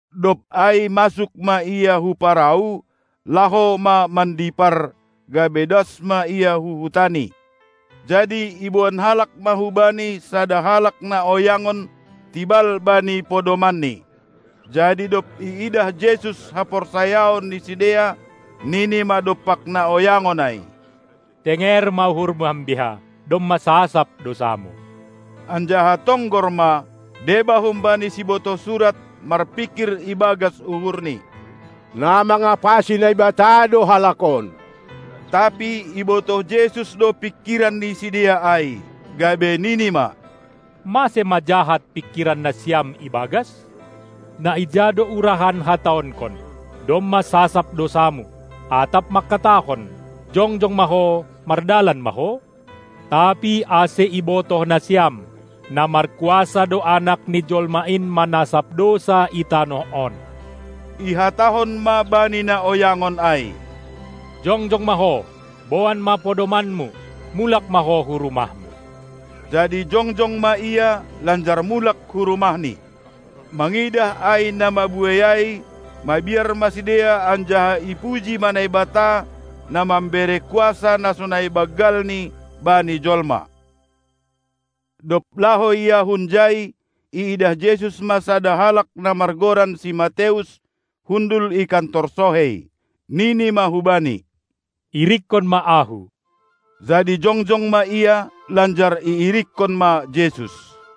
Dob ai masuk ma Ia hu parau, laho ma mandipar, gabe das ma Ia hu hutaNi. Jadi iboan halak ma hu Bani sada halak na oyangon, tibal bani podomanni. Jadi dob iidah Jesus haporsayaon ni sidea, nini ma dompak na oyangon ai: Tenger ma uhurmu ambia, domma sasap dousamu! Anjaha tonggor ma, deba humbani sibotoh surat marpingkir ibagas uhurni: Na mangapasi Naibata do halak on! Tapi ibotoh Jesus do pingkiran ni sidea ai, gabe nini ma: Mase ma jahat pingkiran nasiam ibagas? Na ija do urahan hataonkon: "Domma sasap dousamu", atap mangkatahon: "Jongjong ma ho, mardalan ma ho?" Tapi ase ibotoh nasiam, na markuasa do Anak ni jolma in manasap dousa i tanoh on, ihatahon ma bani na oyangon ai: Jongjong ma ho, boan ma podomanmu, mulak ma ho hu rumahmu! Jadi jongjong ma ia, lanjar mulak hu rumahni. Mangidah ai na mabuei ai, mabiar ma sidea anjaha ipuji ma Naibata, na mambere kuasa na sonai banggalni bani jolma. Dob laho ia hunjai, iidah Jesus ma sada halak na margoran si Mateus, hundul i kantor sohei. Nini ma hubani: Irikkon ma Ahu! Jadi jongjong ma ia, lanjar iirikkon ma Jesus.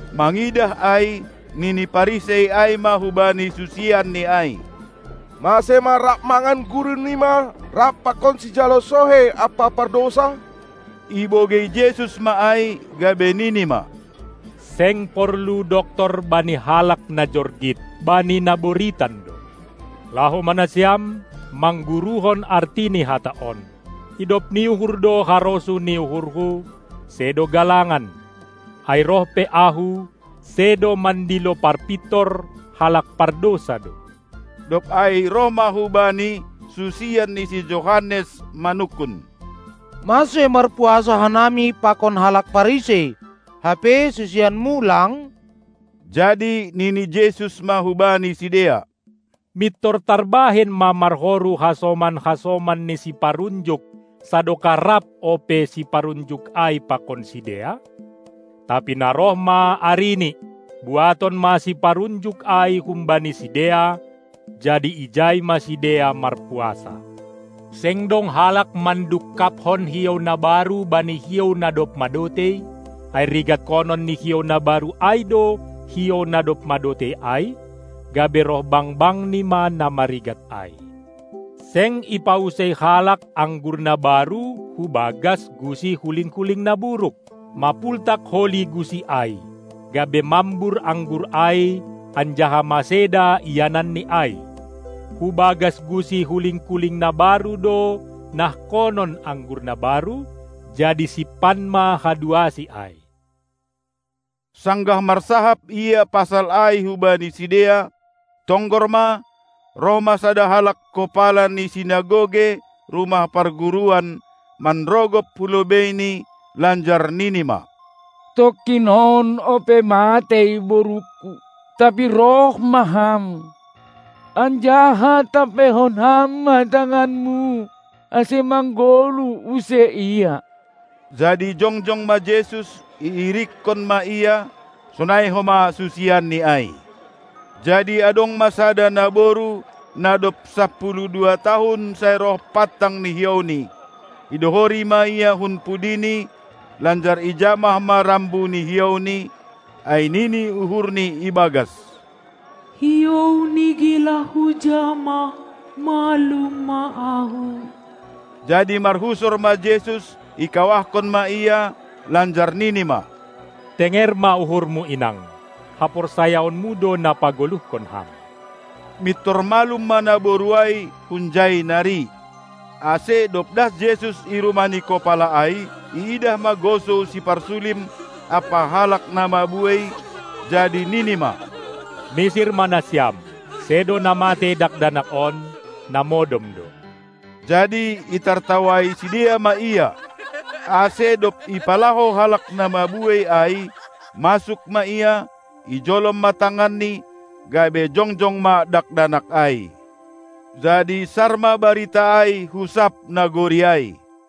Mangidah ai, nini Parisei ai ma hubani susianNi ai: Mase ma rap mangan Gurunima rap pakon sijalo sohei ampa pardousa? Ibogei Jesus ma ai, gabe nini ma: Seng porlu doktor bani halak na jorgit, bani na boritan do. Laho ma nasiam, mangguruhon arti ni hata on: Idop ni uhur do harosuh ni uhurHu, sedo galangan. Ai roh pe Ahu, sedo mandilo parpintor, halak pardousa do. Dob ai roh ma hu Bani susian ni si Johannes manungkun: Mase marpuasa hanami pakon halak Parisei, hape susianMu lang? Jadi nini Jesus ma hubani sidea: Mintor tarbahen ma marhoru hasoman-hasoman ni siparunjuk sadokah rap ope siparunjuk ai pakon sidea? Tapi na roh ma arini, buaton ma siparunjuk ai humbani sidea, jadi ijai ma sidea marpuasa. Seng dong halak mandungkaphon hiou na baru bani hiou na dob madotei, ai rigatkonon ni hiou na baru ai do hiou na dob madotei ai, gabe roh bangbangni ma na marigat ai. Seng ipausei halak anggur na baru hu bagas gusi huling-kuling na buruk, mapultak holi gusi ai, gabe mambur anggur ai anjaha maseda iananni ai. Hu bagas gusi huling-kuling na baru do nahkonon anggur na baru, jadi simpan ma haduasi ai. Sanggah marsahap Ia pasal ai hubani sidea, tonggor ma, roh ma sada halak kopala ni sinagoge (rumah parguruan), manrogop hu lobeiNi, lanjar nini ma: Tongkin on ope matei borungku; tapi roh ma Ham, anjaha tampeihon Ham ma tanganMu, ase manggoluh use ia. Jadi jongjong ma Jesus, iirikkon ma ia, sonai homa susianNi ai. Jadi adong ma sada naboru, na dob sapuluh dua tahun sai roh pantang ni hiouni; idohori ma Ia hun pudiNi lanjar ijamah ma rambu ni hiouNi, ai nini uhurni ibagas: HiouNi gelah hujamah, malum ma ahu. Jadi marhusor ma Jesus, ikawahkon ma ia, lanjar nini ma: Tenger ma uhurmu inang, haporsayaonmu do na pagoluhkon ham! Mintor malum ma naboru ai hunjai nari. Ase dob das Jesus i rumah ni kopala ai, iidah ma gosou siparsulim ampa halak na mabuei, jadi nini ma: Misir ma nasiam! Sedo na matei dakdanak on, na modom do. Jadi itartawai sidea ma Ia. Ase dob ipalaho halak na mabuei ai, masuk ma Ia, ijolom ma tanganni, gabe jongjong ma dakdanak ai. Jadi sar ma barita ai hu sab nagori ai.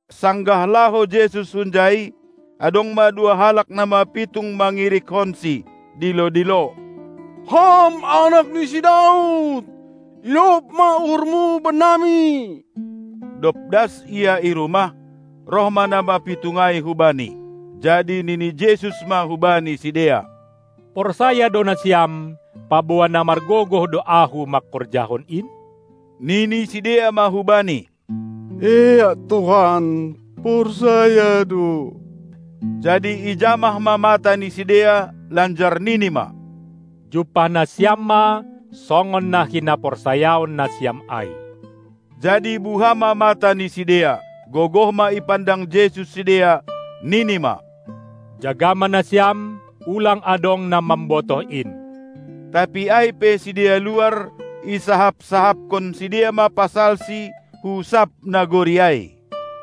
Sanggah laho Jesus hunjai, adong ma dua halak na mapitung mangirikkonSi, dilo-dilo: Ham Anak ni si Daud! Idop ma uhurMu bennami! Dob das Ia i rumah, roh ma na mapitung ai hu Bani. Jadi nini Jesus ma hubani sidea: Porsaya do nasiam, paboa na margogoh do Ahu mangkorjahon in? Nini sidea ma hu Bani: Eak Tuhan, porsaya do! Jadi ijamah ma mata ni sidea, lanjar nini ma: Jumpah nasiam ma songon na hinaporsayaon nasiam ai! Jadi buha ma mata ni sidea. Gogoh ma ipandang Jesus sidea, nini ma: Jaga ma nasiam, ulang adong na mambotoh in! Tapi ai pe sidea luar, isahap-sahapkon sidea ma pasalSi hu sab nagori ai.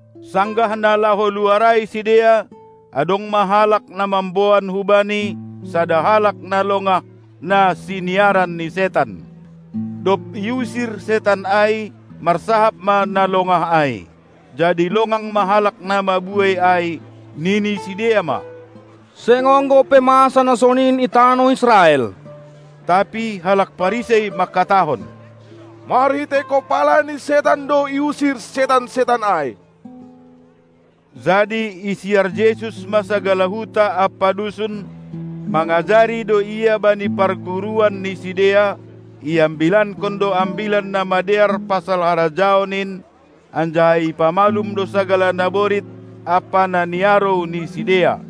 Sanggah na laho luar ai sidea, adong ma halak na mamboan hu-Bani sada halak na longah, na siniaran ni setan. Dob iusir setan ai, marsahap ma na longah ai. Jadi longang ma halak na mabuei ai, nini sidea ma: Seng ongga ope masa na sonin i tanoh Israel. Tapi halak Parisei mangkatahon: Marhitei kopala ni setan do iusir setan-setan ai. Jadi isiar Jesus ma sagala huta ampa dusun; mangajari do Ia bani parguruan ni sidea, iambilankon do Ambilan Namadear pasal harajaon in, anjaha ipamalum do sagala naborit ampa na niarou ni sidea.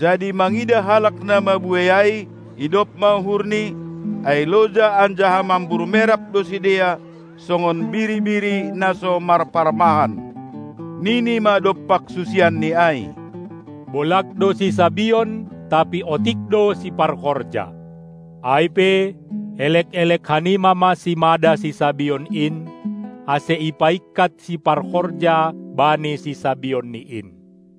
Jadi mangidah halak na mabuei ai, idop ma uhurNi, ai loja anjaha mambur merap do sidea songon biri-biri na so marparmahan. Nini ma dompak susianNi ai: Bolag do sisabion, tapi otik do siparhorja. Ai pe, elek-elek hanima ma simada sisabion in, ase ipaingkat siparhorja bani sisabionni in!